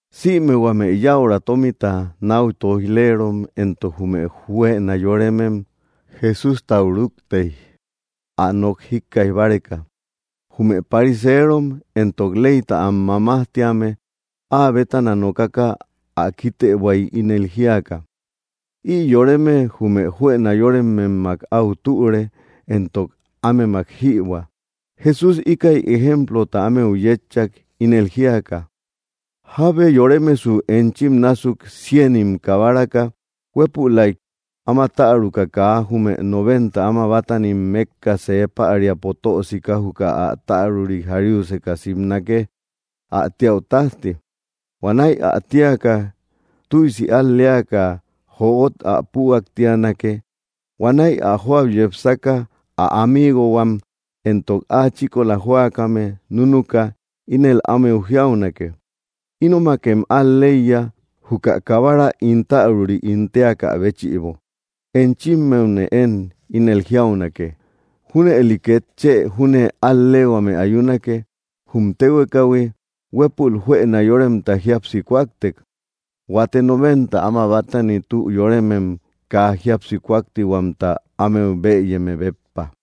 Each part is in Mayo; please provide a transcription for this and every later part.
Sïme huame yäura tómita náu tóij‑leerom éntok jume juëna yóremem Jesústau rúktey, ä nok jíkkaij báreka. Jume pariseerom éntok leyta am mamajtíame áa bétana nokaka ä kítëbuay, ínel jíaka: —Ï yoreme jume juëna yórememmak au türe, éntok ámemak jïbuä. Jesús íkäi ejemplota ámeu yétchak, ínel jíaka: —¿Jábe yoremesu enchim násuk, cienim kabaraka, huépülaik áma täruka, kaa jume noventa áma bátanim mékka see päriapo tö sika juka ä täruri jariuseka simnake ä tíäu tájti? Huanäi ä tíaka, tüisi al‑leaka jöot ä püaktianake. Huanäi ä jóau yepsaka, ä amiigohuam éntok áa chíkola jóakame núnuka, ínel ámeu jiaunake: ‘‘Ínomakem al‑leiya, juka kabara ín täruri ín téakä béchïbo.” Enchimmeune én ínel jiaunake, junëli két chë júne al‑leehuame ayunake jum téhuekahui, huépul juëna yóremta jíapsi kúaktek, huate noventa áma bátani tü yóremem kaa jíapsi kúaktihuamta ámeu bëyeme béppa.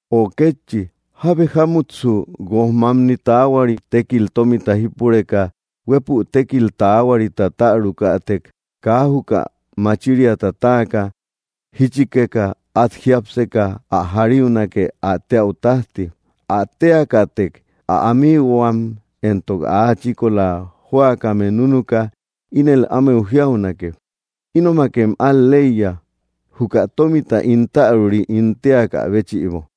’O kétchi, ¿jábe jámutsu guojmamni taahuari tékil tómita jípureka, huépu tékil taahuarita tärukätek, kaa juka machiriata táaka, jíchikeka át jiápseka ä jariunake ä téäu tájti? Ä téakätek, ä amiigohuam éntok áa chíkola jóakame núnuka, ínel ámeu jiaunake: “Ínomakem al‑leiya, juka tómita ín täruri ín téakä béchïbo.”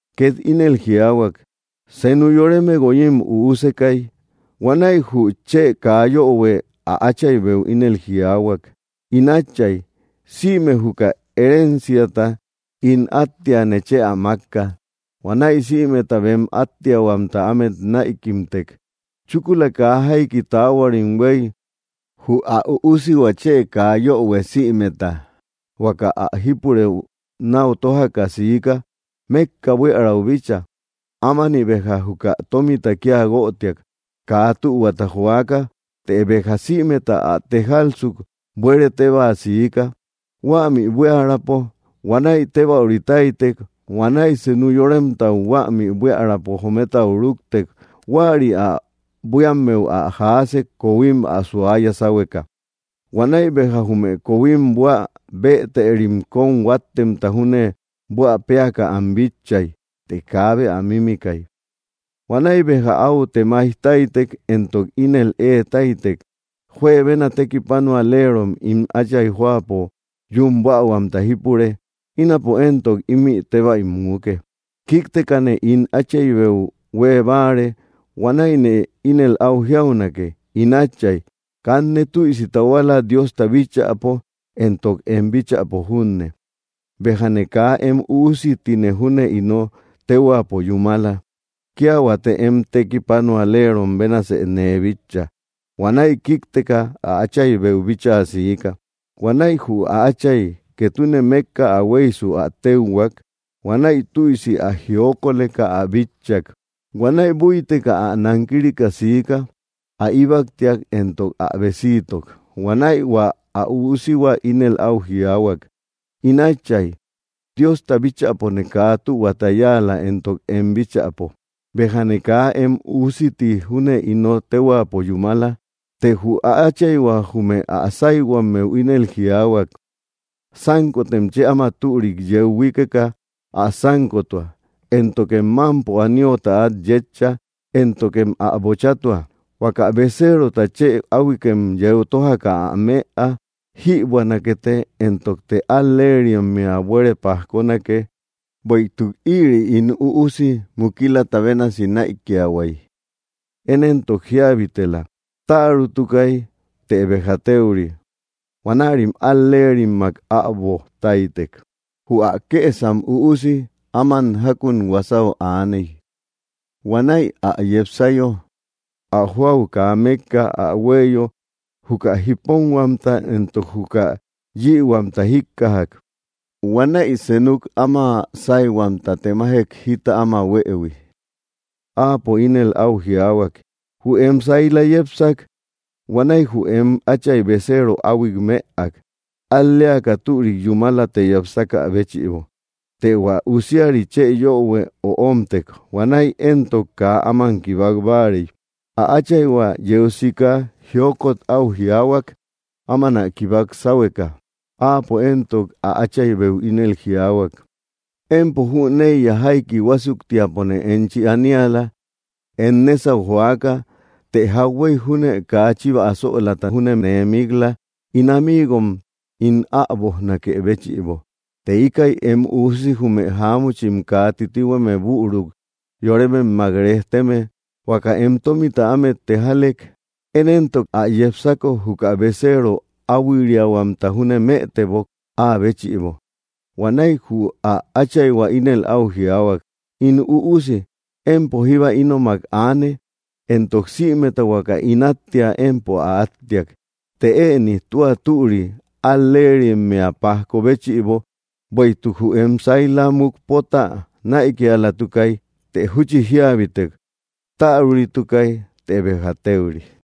Két ínel jiaahuak: —Senu yoreme guoyim üusekay, huanäi jü chë kaa yöhue ä áchaybeu ínel jiaahuak: “In átchay, sïme juka herenciata ín áttia, nechë ä mákka.” Huanäi sïmeta bem áttiahuamta ámet näikimtek. Chúkula kaa jaiki taahuarim huéy, jü ä üusihua chë kaa yöhue sïmeta huaka ä jípurëu náu tójaka siika, mékka buiärau bíchaa. Ámani béja juka tómita kía guötiak, kaa tühuata joaka. Të béja sïmeta ä tejalsuk, buere tébaa siika, huämi buiärapo. Huanäi tébäuri táytek. Huanäi senu yoremtau huämi buiärapo jometau rúktek. Huäri ä buíammeu ä jaasek, kohuim ä suaya sáhueka. Huanäi béja jume kohuim buä bëteri kóm huáttemta júne buä péaka am bitchay, të kaabe ä mimikay. Huanäi béja áu temai táytek, éntok ínel ée táytek: “¡Juebena tekipanualerom ín átchay jóapo yún buähuamta jípure! ¡Ínapo éntok ímï tébäi muuke! Kíktekane ín áchaybeu huée báare. Huanäine ínel áu jiaunake: In átchay, kanne tüisi tahuala Diosta bíchäpo éntok em bíchäpo junne; béjane kaa em üusi ti júne ino téhuaapo yúmala; kía huate em tekipanualerom bénasë nee bitcha.” Huanäi kíkteka, ä áchaybeu bíchaa siika. ’Huanäi jü ä átchay, ketune mékka ä huéysu, ä téuhuak. Huanäi tüisi ä jiokoleka ä bitchak. Huanäi búiteka ä nankirika siika. Ä íbaktiak, éntok ä besiitok. Huanäi hua ä üusihua ínel áu jiaahuak: “In átchay, Diosta bíchäpone kaa tühuata yáala, éntok em bíchäpo. Béjane kaa em üusi ti júne ino téhuaapo yúmala.” Të jü ä áchayhua jume ä sáyhuammeu ínel jiaahuak: ‘‘Sánkotem chë áma türik yeu huíkeka ä sánkotua, éntokem mámpo aniota át yétcha, éntokem ä bochatua. Huaka beceerota chë áhuikem yeu tójaka ä mëa. Jïbuänakete, ¡éntokte al‑leerimmea buere pajkonake! Bueïtuk ïri ín üusi mukilata bénasi näikiahuay; én éntok jíabitela. Tärutukay; të béja téuri.” Huanärim al‑leerimmak äboj táytek. ’Jü ä kësam üusi áman jákun huasau aaney. Huanäi ä yepsayo, ä jóau kaa mékka ä huéyo, juka jiponhuamta éntok juka yïhuamta jíkkajak. Huanäi senuk áma sáyhuamta temajek jita áma huëhui. Áapo ínel áu jiaahuak: ‘‘Jü em saila yepsak. Huanäi jü em átchay beceero áhuik mëak, al‑leaka türik yúmalata yepsakä béchïbo.” Të hua usiari chë yöhue öomtek. Huanäi éntok kaa áman kibak báarey. Ä áchayhua yeu sika jiokot áu jiaahuak, áman ä kibak sáhueka. Áapo éntok ä áchaybeu ínel jiaahuak: ‘‘Empo jüneiya jaiki huásuktiapone enchi aniala, em nésau joaka, të jauhuey júne kaa chiva asölaata júne nee mik‑la ín amiigom ín äbojnakë béchïbo. Të íkä em üusi jume jáamuchim kaa titihueme büru yorememmak rejteme, huaka em tómita ámet tejalek. Én éntok ä yepsako, juka beceero áhuiriahuamta júne mëtebok, áa béchïbo.” Huanäi jü ä áchayhua ínel áu jiaahuak: ‘‘In üusi, empo jíba ínomak aane, éntok sïmeta huaka ín áttia, empo ä áttiak. Të ëni tua türi al‑leerimmea pajko béchïbo, bueïtuk jü em saila mukpotä näikialatukay, të júchi jíabitek. Täruritukay, të béja téuri.”